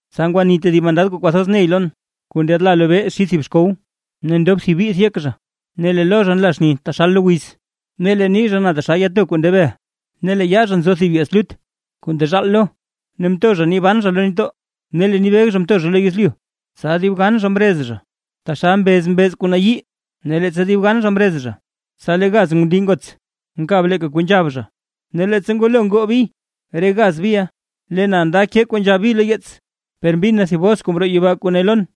Tsa ngwani tedib mandad kuu kwathoz ney lon, kuu ndyaadla lobee xid thib xkow, ne ndob thib bith yek zha. Ne lee lo zha nla xni taxal wiz, ne lee nii zha na taxal yato kuu nde bel. Ne lee yaa zha nzo thib yeets lut kuu ndezhaal lo, ne mto zha nii ban zha lo nitdoo ne lee nii beg zha mto zha lo yezlyu. Tsa dib gan zha mrez zha, taxal mbez mbeez kuu nayii, ne leettsa dib gan zha mrez zha, tsa lee gaz ngundii ngots mkab leeka kuu nzhab zha. Ne leettsa ngwalo ngoo bi re gaz biʼa, lee na nda kee kuu nzhab bi lo yeets; per mbin na thib bos kuu mroo yibaa kuu ne lon: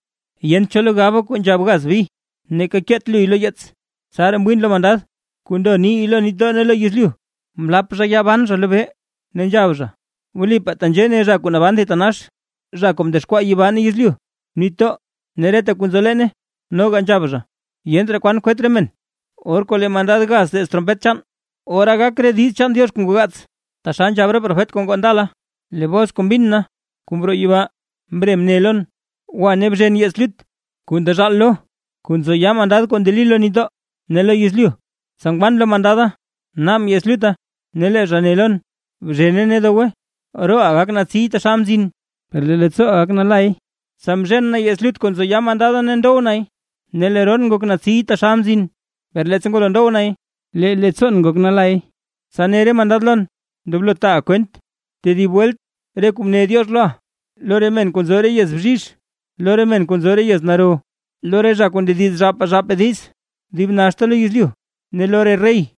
―Yent cho lo gaba kuu nzhab gaz bi, neeka keet luy lo yeets. Tsaraa mwiin lo mandad kuu ndo nii lo nitdoo ne lo yezlyu, mlap zha yaa ban zha lobee, ne nzhab zha: ―Wlipaa tenzhee ne zha kuu naban thitanax, zha kuu mdexkwaa yibaa, yezlyu, nitdoo ne reta kuu nzo leene. Noga nzhab zha: ―Yent raa kwan kwet re men, or kuu lee mandad gaz teez trompet chaan, ora gak re diiz chaan Diox kuu ngoo gaats, taxal nzhab re profet kuu ngoo ndala. Lee bos kuu mbin na, kuu mroo yibaa, mre mne lon: ―Gwa ne bzhen yeets lut kuu ndezhaal lo, kuu nzo yaa mandad kuu ndeli lo nitdoo ne lo yezlyu. Tsa ngwan lo mandada, mnaabʼn yeets lutta ne lee zha ne lon: ―Bzhene ne dowe. Rooʼa gak natsiy taxal mzin, per lee leettsooʼa gak nalay. Tsa mzhen na yeets lut kuu nzo yaa mandada ne ndow nay; ne lee roon ngok natsiy taxal mzin, per leettsa ngwalo ndow nay, lee leettsoon ngok nalay. Tsa ne re mandad lon: ―Ndoblo taaʼa kwent tedib welt re kuu mne Diox loʼa, lo re men kuu nzo re yez bzhizh, lo re men kuu nzo re yez naro, lo re zha kuu ndediz zhaapaa zhaapaa diiz dib naxta lo yezlyu ne lo re rey.